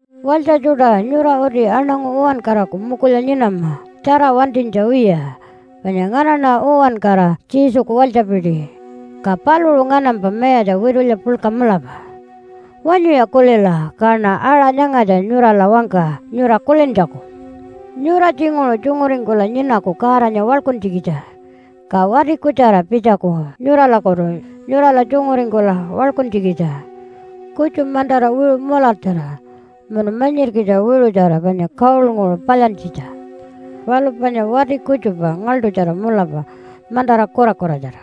Walytja tjuṯa, nyura uti aṉangu uwankaraku mukulya nyinama tjara wantinytja wiya, panya nganaṉa uwankara Jesuku walytjapiti, ka paluṟu nganampa Mayatja witulya puḻka mulapa. Wanyuya kulila, kaṉa aṟa nyangatja nyurala wangka nyura kulintjaku. Nyura tjinguṟu tjunguringkula nyinaku Godanya waḻkuntjikitja, ka wati kutjara pitjaku nyuralakutu nyurala tjunguringkula waḻkuntjikitja. Kutju mantara wiṟu mulartjara munu manyirkitja wiṟutjara panya gold-nguṟu palyantjitja. Palu panya wati kutjupa ngaḻṯutjara mulapa, mantara kurakuratjara.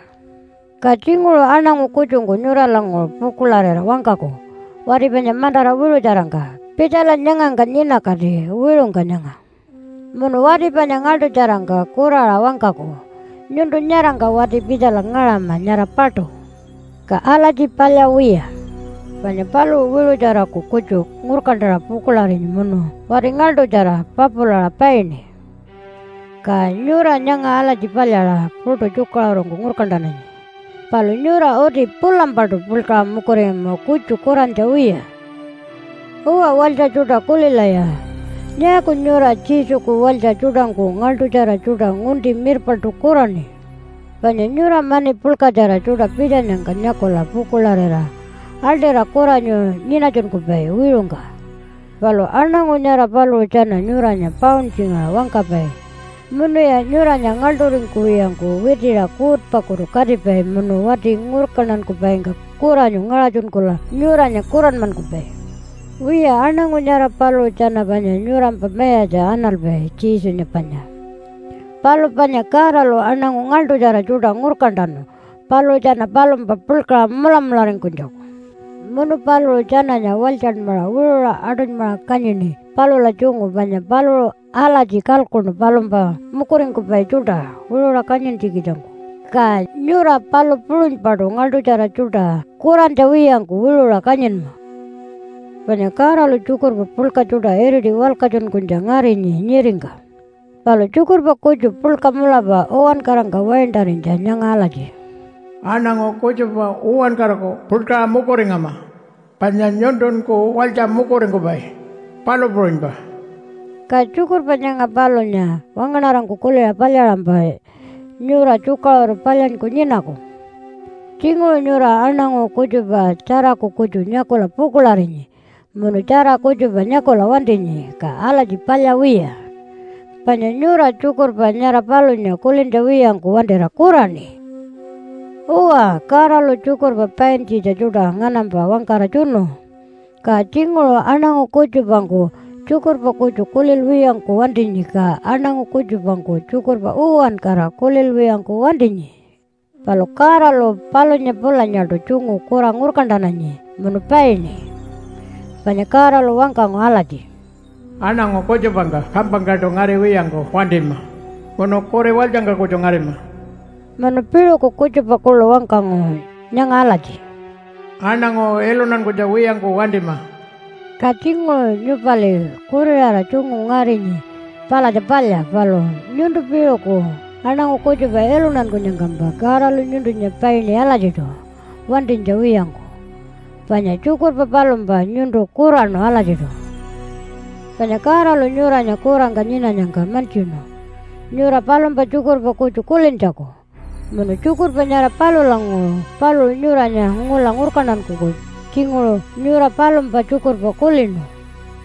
Ka tjinguṟu aṉangu kutjungku nyuralanguṟu pukuḻarira wangkaku wati panya mantara wiṟutjarangka, “Pitjala nyangangka nyinakati wiṟungka nyanga.” Munu wati panya ngaḻṯutjarangka kuraṟa wangkaku, “Nyuntu nyarangka wati-pitjala ngaṟama nyara paṯu.” Ka alatji palya wiya. Panya paluṟu wiṟutjaraku kutju ngurkantaṟa pukuḻarinyi munu wati ngaḻṯutjara papulaṟa paini. Ka nyura nyanga alatji palyaṟa puṯu tjukaṟurungku ngurkantananyi, palu nyura uti pulampaṯu puḻkaṟa mukuringama kutju kurantja wiya. Uwa, walytja tjuṯa, kulilaya. Nyaaku nyura Jesuku walytja tjuṯangku ngaḻṯutjara tjuṯa ngunti mirpaṉṯu kuraṉi? Panya nyura mani puḻkatjara tjuṯa pitjanyangka nyakula pukuḻarira aḻṯira kuranyu nyinatjunkupai wiṟungka. Palu aṉangu nyara paluṟu tjana nyuranya pauntjingaṟa wangkapai, munuya nyuranya ngaḻṯuringkuwiyangku witiṟa kuutpakutu katipai munu wati ngurkantankupaingka kuranyu ngaṟatjunkula nyuranya kuranmankupai. Wiya, aṉangu nyara paluṟu tjana panya nyurampa mayatja analpai, Jesunya panya. Palu panya Godalu aṉangu ngaḻṯutjara tjuṯa ngurkantanu paluṟu tjana palumpa puḻkaṟa mulamularingkunytjaku. Munu paluṟu tjananya walytjanmaṟa wiṟuṟa aṯunymaṟa kanyini palula tjungu, panya paluṟu alatji kalkuṉu palumpa mukuringkupai tjuṯa wiṟuṟa kanyintjikitjangku. Ka nyura palu puṟunypaṯu ngaḻṯutjara tjuṯa kurantja wiyangku wiṟuṟa kanyinma. Panya Godalu tjukurpa puḻka tjuṯa iriti walkatjunkunytja ngarinyi nyiringka, palu tjukurpa kutju puḻka mulapa uwankarangka waintarinytja nyanga alatji, “Aṉangu kutjupa uwankaraku puḻkaṟa mukuringama, panya nyuntunkun walytja mukuringkupai, palu puṟunypa.” Ka tjukurpa nyanga palunya wangaṉarangku kuliṟa palyaṟampa nyura tjukaṟuru palyanyku nyinaku. Tjinguṟu nyura aṉangu kutjupa tjaraku kutju nyakula pukuḻarinyi munu tjara kutjupa nyakula wantinyi, ka alatji palya wiya. Panya nyura tjukurpa nyara palunya kulintja wiyangku wantira kuraṉi. Uwa, Godalu tjukurpa paintjitja tjuṯa nganampa wangkara tjunu. Ka tjinguṟu aṉangu kutjupangku tjukurpa kutju kulilwiyangku wantinyi, ka aṉangu kutjupangku tjukurpa uwankara kulilwiyangku wantinyi. Palu Godalu palunya pulanyaṯu tjungu kura ngurkantananyi munu paini. Panya Godalu wangkangu alatji, “Aṉangu kutjupangka kampangkaṯu ngariwiyangku wantima, munu kuri walytjangka kutju ngarima.” Munu piṟuku kutjupa kuḻu wangkangu nyanga alatji, “Aṉangu iluntankunytja wiyangku wantima.” Ka tjinguṟu nyupali kuriṟara tjungu ngarinyi palatja palya, palu nyuntu piṟuku aṉangu kutjupa iluntankunyangkampa Godalu nyuntunya paini alatjiṯu wantinytja wiyangku, panya tjukurpa palumpa nyuntu kuraṉu alatjiṯu. Panya Godalu nyuranya kurangka nyinanyangka mantjinu nyura palumpa tjukurpa kutju kulintjaku. Munu tjukurpa nyara palulanguṟu paluṟu nyuranya ngula ngurkantankuku, tjinguṟu nyura palumpa tjukurpa kulinu,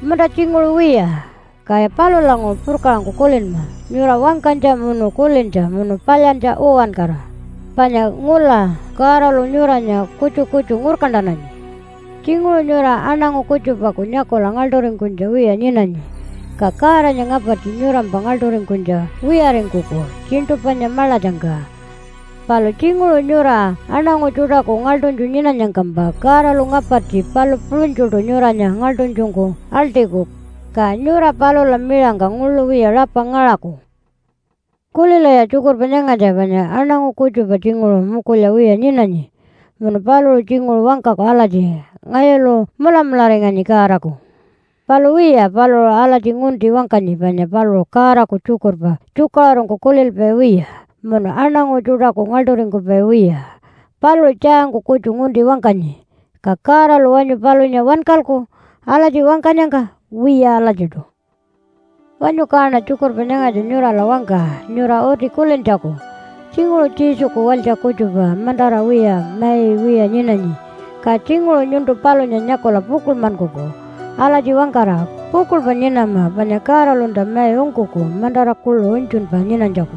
munta tjinguṟu wiya. Kaya palulanguṟu purkaṟangku kulinma nyura wangkanytja, munu kulintja, munu palyantja uwankara, panya ngula Godalu nyuranya kutju kutju ngurkantananyi. Tjinguṟu nyura aṉangu kutjupaku nyakula ngaḻṯuringkunytja wiya nyinanyi, ka Godanya ngapartji nyurampa ngaḻṯuringkunytja wiyaringkuku tjiṉṯu panya maḻatjangka. Palu tjinguṟu nyura aṉangu tjuṯaku ngaḻṯunytju nyinanyangkampa Godalu ngapartji palu puṟunytjuṯu nyuranya ngaḻṯunytjungku aḻṯiku, ka nyura palula miṟangka nguḻu wiya rapa ngaṟaku. Kulilaya tjukurpa nyangatja. Panya aṉangu kutjupa tjinguṟu mukulya wiya nyinanyi munu paluṟu tjinguṟu wangkaku alatji, “Ngayulu mulamularinganyi Godaku.” Palu wiya, paluṟu alatji ngunti wangkanyi panya paluṟu Godaku tjukurpa tjukaṟurungku kulilpai wiya munu aṉangu tjuṯaku ngaḻṯuringkupai wiya. Paluṟu tjaangku kutju ngunti wangkanyi. Ka Godalu wanyu palunya wankalku alatji wangkanyangka? Wiya alatjiṯu. Wanyu kaṉa tjukurpa nyangatja nyurala wangka nyura uti kulintjaku. Tjinguṟu Jesuku walytja kutjupa mantara wiya mai wiya nyinanyi. Ka tjinguṟu nyuntu palunya nyakula pukuḻmankuku alatji wangkara, “Pukuḻpa nyinama, panya Godalunta mai ungkuku mantara kuḻu unytjunpa nyinanytjaku.”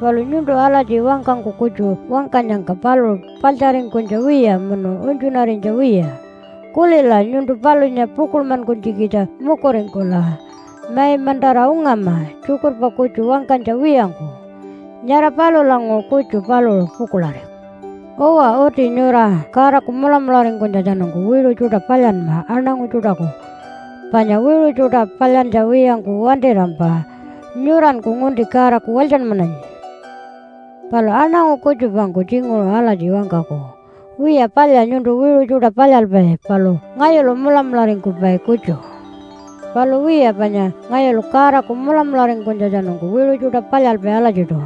Palu nyuntu alatji wangkangku kutju wangkanyangka paluṟu paḻtjaringkunytja wiya munu unytjunarinytja wiya. Kulila, nyuntu palunya pukuḻmankunytjikitja mukuringkula mai mantara ungama tjukurpa kutju wangkanytja wiyangku. Nyara palulanguṟu kutju paluṟu pukuḻariku. Uwa, uti nyura Godaku mulamularingkunytjatjanungku wiṟu tjuṯa palyanma aṉangu tjuṯaku. Panya wiṟu tjuṯa palyantja wiyangku wantirampa nyuranku ngunti Godaku walytjanmananyi. Palu aṉangu kutjupangku tjinguṟu alatji wangkaku, “Wiya, palya nyuntu wiṟu tjuṯa palyalpai, palu ngayulu mulamularingkupai kutju.” Palu wiya, panya ngayulu Godaku mulamularingkunytjatjanungku wiṟu tjuṯa palyalpai alatjiṯu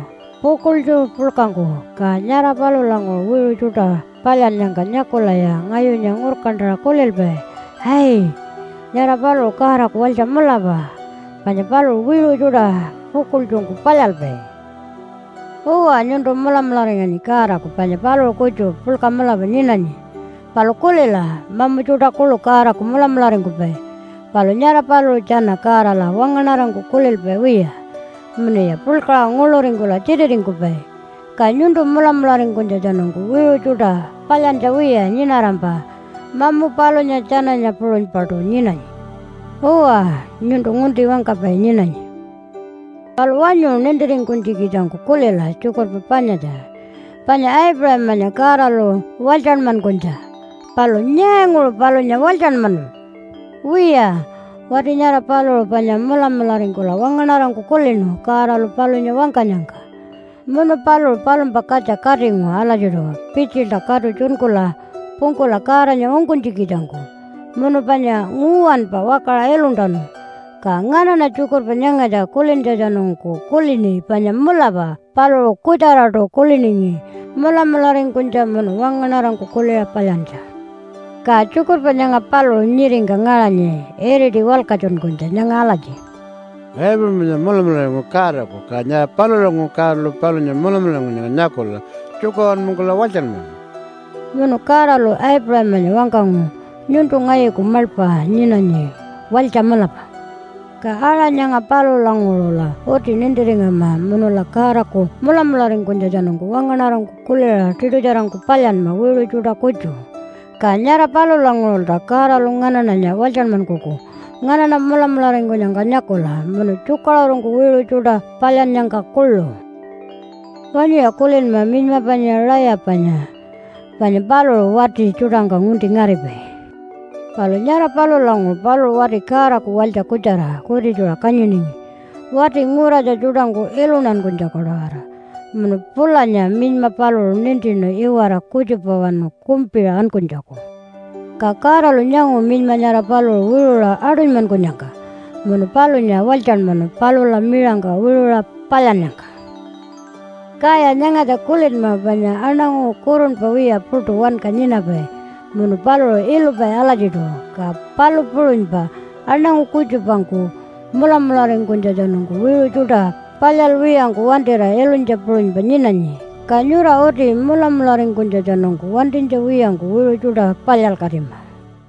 pukuḻtju puḻkangku. Ka nyara palulanguṟu wiṟu tjuṯa palyannyangka nyakulaya ngayunya ngurkantaṟa kulilpai, “Ai, nyara paluṟu Godaku walytja mulapa, panya paluṟu wiṟu tjuṯa pukuḻtjungku palyalpai.” Uwa, nyuntu mulamularinganyi Godaku, panya paluṟu kutju puḻka mulapa nyinanyi. Palu kulila, mamu tjuṯa kuḻu Godaku mulamularingkupai, palu nyara paluṟu tjana Godala wangaṉarangku kulilpai wiya munuya puḻkaṟa nguḻuringkula tjititingkupai. Ka nyuntu mulamularingkunytjatjanungku wiṟu tjuṯa palyantja wiya nyinarampa mamu palunya tjananya puṟunypaṯu nyinanyi. Uwa, nyuntu ngunti wangkapai nyinanyi. Palu wanyu nintiringkunytjikitjangku kulila tjukurpa panyatja, panya Aipuṟamanya Godalu walytjanmankunytja. Palu nyaanguṟu palunya walytjanmanu? Wiya, wati nyara paluṟu panya mulamularingkula wangaṉarangku kulinu Godalu palunya wangkanyangka, munu paluṟu palumpa katja katingu alatjiṯu pitjilta katu tjunkula pungkula Godanya ungkunytjikitjangku, munu panya nguwanpa wakaṟa iluntanu. Ka nganaṉa tjukurpa nyangatja kulintjatjanungku kulini panya mulapa paluṟu kutjaraṯu kuliningi mulamularingkunytja munu wangaṉarangku kuliṟa palyantja. Ka tjukurpa nyanga paluṟu nyiringka ngaṟanyi iriti walkatjunkunytja nyanga alatji, “Aipuṟamanya mulamularingu Godaku. Ka nyara palulanguṟu Godalu palunya mulamularingkunyangka nyakula tjukaṟurunmankula walytjanmanu.” Munu Godalu Aipuṟamanya wangkangu, “Nyuntu ngayuku maḻpa nyinanyi, walytja mulapa.” Ka aṟa nyanga palulanguṟula uti nintiringama munula Godaku mulamularingkunytjatjanungku wangaṉarangku kuliṟa tiṯutjarangku palyanma wiṟu tjuṯa kutju. Ka nyara palulanguṟulta Godalu nganaṉanya walytjanmankuku nganaṉa mulamularingkunyangka nyakula munu tjukaṟurungku wiṟu tjuṯa palyannyangka kuḻu. Wanyuya kulinma minyma panya Rayapanya. Panya paluṟu wati tjuṯangka ngunti ngaripai. Palu nyara palulanguṟu paluṟu wati Godaku walytja kutjara kutitjuṟa kanyiningi wati nguratja tjuṯangku iluntankunytjaku-tawara. Munu pulanya minyma paluṟu nintinu iwara kutjupawanu kumpiṟa ankunytjaku. Ka Godalu nyangu minyma nyara paluṟu wiṟuṟa aṯunymankunyangka, munu palunya walytjanmanu palula miṟangka wiṟuṟa palyannyangka. Kaya nyangatja kulinma panya aṉangu kurunpa wiya puṯu wanka nyinapai munu paluṟu ilupai alatjiṯu. Ka palu puṟunypa aṉangu kutjupangku mulamularingkunytjatjanungku wiṟu tjuṯa palyalwiyangku wantira ilunytja puṟunypa nyinanyi. Ka nyura uti mulamularingkunytjatjanungku wantinytja wiyangku wiṟu tjuṯa palyalkatima.